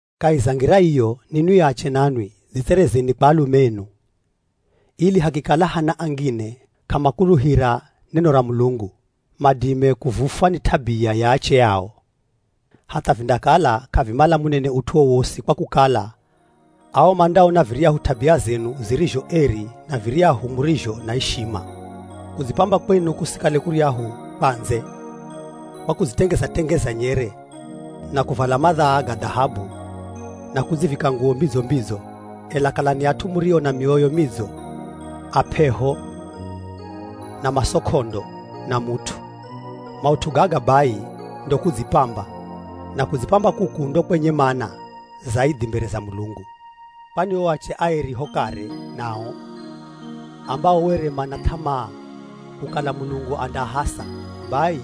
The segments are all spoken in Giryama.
Kahi za ngira iyo, ninwi ache nanwi dzitserezeni kwa alume enu, ili hakikala hana angine k'amakuluhira neno ra Mulungu, madime kuvufwa ni t'abia ya ache ao. Hatha vindakala k'avimala munene ut'u wowosi kwa kukala ao mandaona viryahu t'abia zenu zirizho eri na viryahu murizho na ishima. Kudzipamba kwenu kusikale kuryahu kwa ndze, kwa kudzitengeza-tengeza nyere na kuvala madhaa ga dhahabu na kudzivika nguwo mbidzo-mbidzo. Ela kalani at'u murio na mioyo midzo, ap'eho na maso k'ondo na mut'u. Maut'u gaga bai ndo kudzipamba, na kudzipamba kuku ndo kwenye mana zaidhi mbere za Mulungu. Kwani o ache aeri ho kare nao, ambao were mana th'amaa kukala Mulungu andaahasa, bai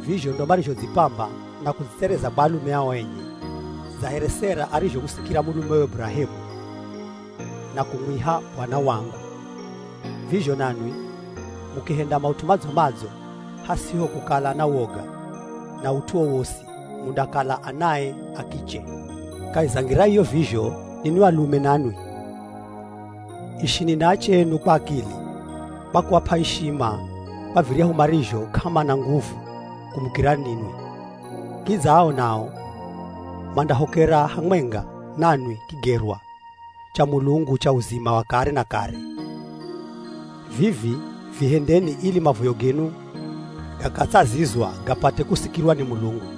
vizho ndo marizhodzipamba na kudzitsereza kwa alume ao enye. Dza here Sera arizhomusikira mulumewe Burahemu na kumwiha “Bwana wangu,” vizho nanwi mukihenda maut'u madzo-madzo hasiho kukala na woga na ut'u wowosi, mundakala anae a kiche. Kahi za ngira iyo vizho, ninwi alume nanwi, ishini na ache enu kwa akili, kwa kuap'a ishima kwa viryahu marizho k'amana nguvu kumukira ninwi, kidza ao nao mandahokera hamwenga nanwi kigerwa cha Mulungu cha uzima wa kare na kare. Vivi vihendeni ili mavoyo genu gakatsazizwa gapate kusikirwa ni Mulungu.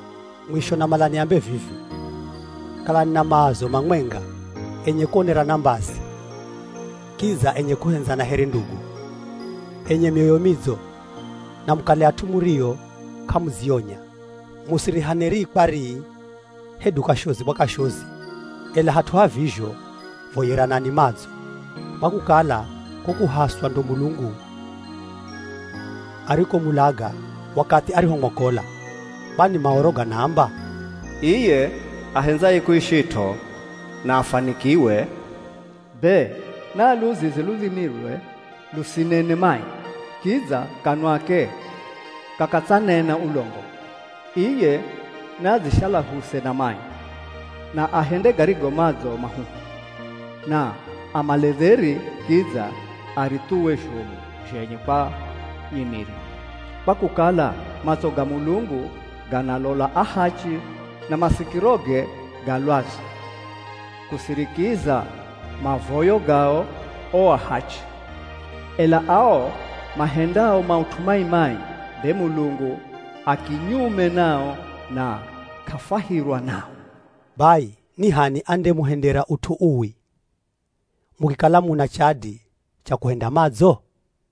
Mwisho namala niambe vivi, kalani na maazo mamwenga, enye kuonerana mbazi, kidza enye kuhendzana here ndugu, enye mioyo midzo, na mukale at'u murio k'amudzionya. Musirihane rii kwa rii hedu kashozi kwa kashozi, ela hat'u ha vizho voyeranani madzo, kwa kukala ko kuhaswa ndo Mulungu arikomulaga wakathi arihomwokola. Kwani Maoro ganaamba, “Iye ahendzaye kuishit'o na afwanikiwe, be na aluzize ludhimilwe lusinene mai, kidza kanwake kakatsanena ulongo. Iye naadzishalahuse na mai, na ahende garigo madzo mahuhu, na amale dheri kidza arithuwe zhomu zhenye kwa nyimiri. Kwa kukala matso ga Mulungu ganaalola ahachi na masikiroge ga lwazu kusirikiza mavoyo gao o ahachi. Ela ao mahendao maut'u mai-mai, be Mulungu akinyume nao na k'afwahirwa nao.” Bai ni h'ani andemuhendera ut'u uwi mukikala muna chadi cha kuhenda madzo?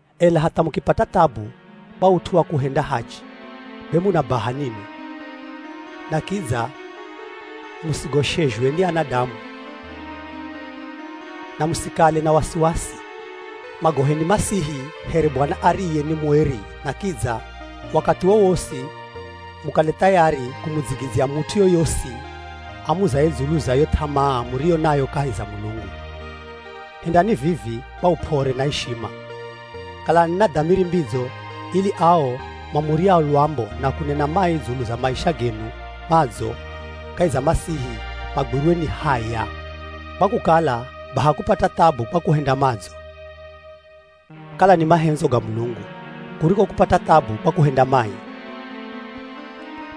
Ela hatha mukipata thabu kwa ut'u wa kuhenda hachi, be muna baha ninwi. Na kidza musigoshezhwe ni anadamu na musikale na wasiwasi. Mwagoheni Masihi here Bwana ariye ni mueri na kidza wakathi wowosi mukale thayari kumudzigidzya mut'u yoyosi amuzaye dzulu za yo th'amaa muriyo nayo kahi za Mulungu. Hendani vivi kwa up'ore na ishima. Kalani na dhamiri mbidzo ili ao mamuryao lwambo na kunena mai dzulu za maisha genu madzo kahi za Masihi magwirwe ni haya. Kwa kukala baha kupata thabu kwa kuhenda madzo, kala ni mahendzo ga Mulungu, kuriko kupata thabu kwa kuhenda mai.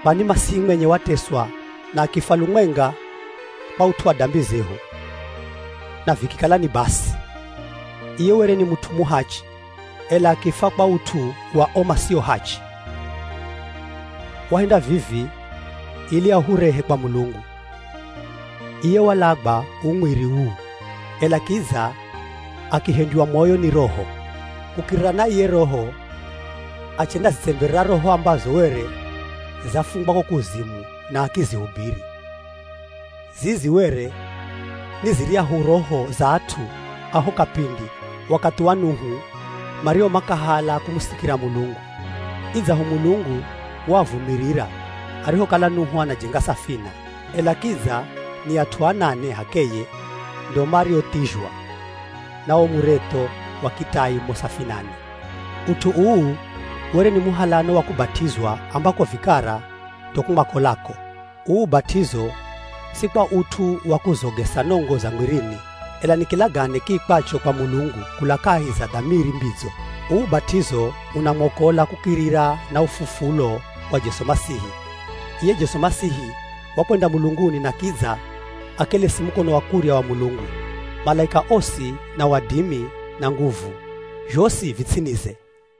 Kwani Masihi mwenye wateswa na akifwa lumwenga kwa ut'u wa dambi zehu na vikikala ni basi. Iye were ni mut'u muhachi, ela akifwa kwa ut'u wa o masio hachi; wahenda vivi ili ahurehe kwa Mulungu. Iye walagwa uu mwiri uu, ela kidza akihendywa moyo ni Roho. Kukirira na iye Roho achendazitsemberera roho ambazo were zafungwa ko kuzimu na akizihubiri. Zizi were ni ziryahu roho za at'u a ho kapindi wakathi wa Nuhu mario makahala kumusikira Mulungu. Idzaho Mulungu waavumirira, arihokala Nuhu anajenga safina, ela kidza ni at'u anane h'akeye ndo marothizhwa na wo muretho wa kitai mo safinani. Ut'u uu were ni muhalano wa kubat'izwa ambako vikara ndo kumwakolako. Uu ubat'izo si kwa ut'u wa kuzogesa nongo za mwirini, ela ni kilagane kiikwacho kwa Mulungu kula kahi za dhamiri mbidzo. Uu ubat'izo unamwokola kukirira na ufufulo wa Jesu Masihi, Iye Jesu Masihi wakwenda mulunguni na kidza akelesi mukono wa kurya wa Mulungu. Malaika osi, na wadimi na nguvu zhosi vi ts'inize.